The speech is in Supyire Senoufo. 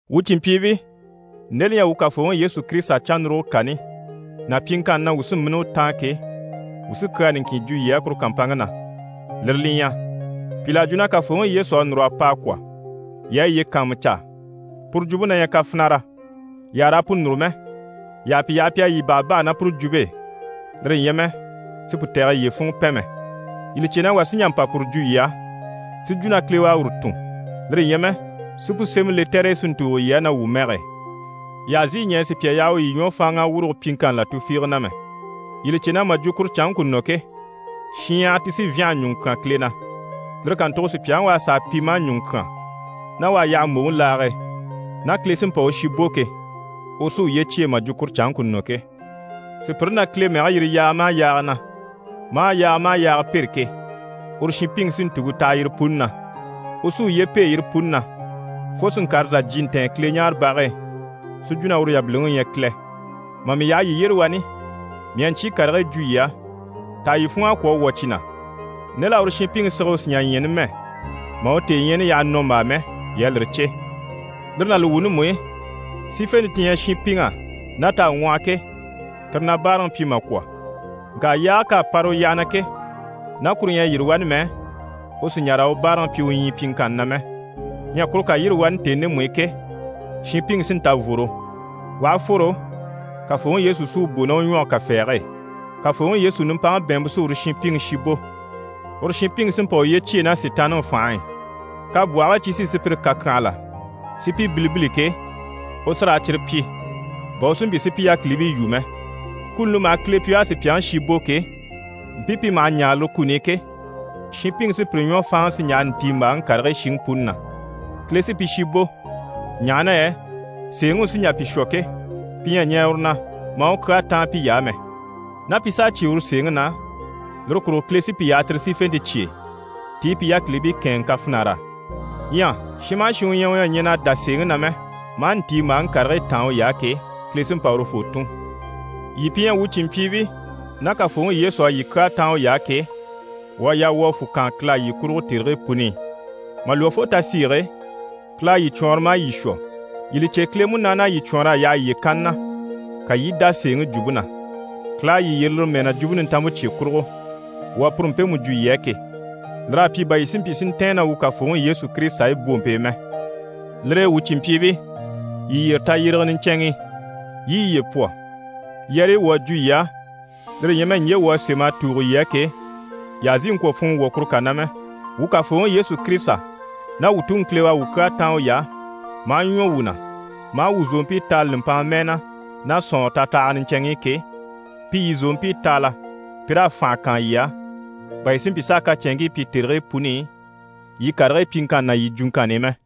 Wuu cìnmpyiibii, nde li ɲyɛ wuu Kafooŋi Yesu Kirisita cannuruge kani, ná pyiŋkanni na wuu sí n‑bínni u taan ke, wuu sí kyaa niŋkin jwo yii á kuru kàmpanŋke na, lire li ɲyɛ: pìl'à jwo na Kafooŋi Yesu à núr'a pa a kwɔ̀. Yii a yiye kàanmucaa! Puru jwumpe na ɲyɛ kafinara, yii àha raa pu núru mɛ. Yii àha pi yaha pi a yii bàhabaha ná puru jwumpe e, lire ɲyɛ mɛ si pu tɛ̀gɛ yiye funŋɔ pɛn mɛ. Yii li cè na wà sí n‑jà n‑pa puru jwo yii á, si jwo na Kile u à uru tun, lire ɲyɛ mɛ si pu sémɛ lɛtɛr'e si ntùugo yii á ná wuu mɛge e. Yii àha zìi ɲɛɛ sùpya yaha u yii ɲwɔ fáanŋa a wurugo pyiŋkanni là tufiige na mɛ. Yii li cè na mà jwo kuru canŋke ku nɔ ke, shinɲyahara ti sí n‑fyânha ɲùŋɔ kyán Kile na. Lire kàntugo sùpyaŋi u à sàa pi maa ɲùŋɔ kyán, ná u à yaha mbòŋi laage e ná Kile sí n‑pa u shi bò ke, uru sí uye cyêe mà jwo kuru canŋke ku nɔ ke. Sùpyire na Kile mɛge yiri yaaga maha yaaga na, maa yaaga maha yaaga pêre ke, uru shinpiŋi sí ntùŋke taha yire puni na. U sí uye pêe yire puni na fo si ŋkàre sà jyè ntɛ̀ɛn Kileɲaarebage e, si jwo na uru yabiliŋi u ɲyɛ Kile. Mà mii yaha yii yyére wani, mii à ɲcyii karigii jwo yii á, taha yii funŋ'à kwɔ̀ a wwɔ̀ cyi na? Nde l'à uru shinpiŋi sige u sì n‑jà ɲya numɛ mà u tèeɲyaani yaha nɔmbaa mɛ, yii à lire cè. Lire ná li wuuni mú i, sífente ti ɲyɛ shinpiŋ'á ná t'à ŋwɔhɔ ke, tire na báaraŋi pyi mà kwɔ̀. Ŋka yaage k'à para u yyaha na ke, ná kuru ɲyɛ a yîri wani mɛ, u sì n‑jà raa u báaraŋi pyi u ɲyii pyiŋkanni na mɛ. Ɲyɛ kuru ká yîri wani tèni ndemu i ke, shinpiŋi sí n‑ta n‑fworo. U aha fworo, Kafooŋi Yesu sí u bò ná u ɲwɔge kafɛɛge e. Kafooŋi Yesu nimpaŋi bɛ̀ɛnmpe sí uru shinpiŋi shi bò. Uru shinpiŋi sí n‑pa uye cyêe ná Sitaanniŋi fànhe e, kabwɔhigii cyi sí sùpyire kàkyanhala si pi bilibili ke, u sí raa cyire pyi, bà u si mpyi si pi yákilibii yû mɛ. Kuni li maha Kile pyi u à sùpyaŋi shi bò ke, mpii pi maha ɲaare lire kuni i ke, shinpiŋi sí pire ɲwɔ fáanŋa si ɲjaha ntiimbaaŋi karigii shiŋi puni na. Kile sí pi shi bò, ɲaha na yɛ sèeŋi u sí n‑jà pi shwɔ ke, pi ɲyɛ a ɲɛɛ uru na, maa u kyaa táan piy'á mɛ. Ná pi s'à cyé uru sèeŋi na, lire kurugo Kile sí pi yaha tire sífente cye e, ti i pi yákilibii kɛ̂ɛnŋɛ kafinar'á. Ɲyɛ shin maha shin u ɲyɛ u ɲyɛ a ɲɛn'a dá sèeŋi na mɛ, maa ntiimbaaŋi karigii táan uy'á ke, Kile sí n‑pa urufoo tùn. Yii pi ɲyɛ wuu cìnmpyiibii ná Kafooŋi Yesu à yii kyaa táan uy'á ke, wuu à yaa wuu a fwù kaan Kile á yii kurugo tèrigii puni i. Mà lwɔ́ fo tasiige e, Kile à yii cwɔɔnrɔ maa yii shwɔ. Yii li cè Kile Munaani à yii cwɔɔnr'a yaha yiye kanni na, ka yii i dá sèeŋi jwumpe na. Kile à yii yyere lire mɛɛ na, Jwumpe Nintanmpe cye kurugo, wuu à puru mpemu jwo yii á ke. Lir'à pyi bà yii si mpyi si ntɛ̀ɛn ná wuu Kafooŋi Yesu Kirisita e u bwompe e mɛ. Lire e wuu cìnmpyiibii, yii yyére tayyérege niɲcɛnŋi i, yii i yiye pwɔ. Yɛrɛyi wuu à jwo yii á, lire ɲyɛ mɛ ɲje wuu à sém'a tùugo yii á ke, yii àha zìi ŋkwɔ̀ funŋɔ wwɔ̀ kuru kà na mɛ. Wuu Kafooŋi Yesu Kirisita ná wuu Tuŋi Kile u à wuu kyaa táan uy'á, maa ɲwɔ wuu na, maa wuu zòompii taala nùmpanŋa mɛɛ na ná sɔ̀nŋɔrɔ tatahaga niɲcɛnŋ'i ke, pi yii zòompii taala, pi raa fànhe kaan yii á, bà yii si mpyi s'a kacɛnŋkii pyi tèrigii puni i, yii karigii pyiŋkanni ná yii jwuŋkanni i mɛ.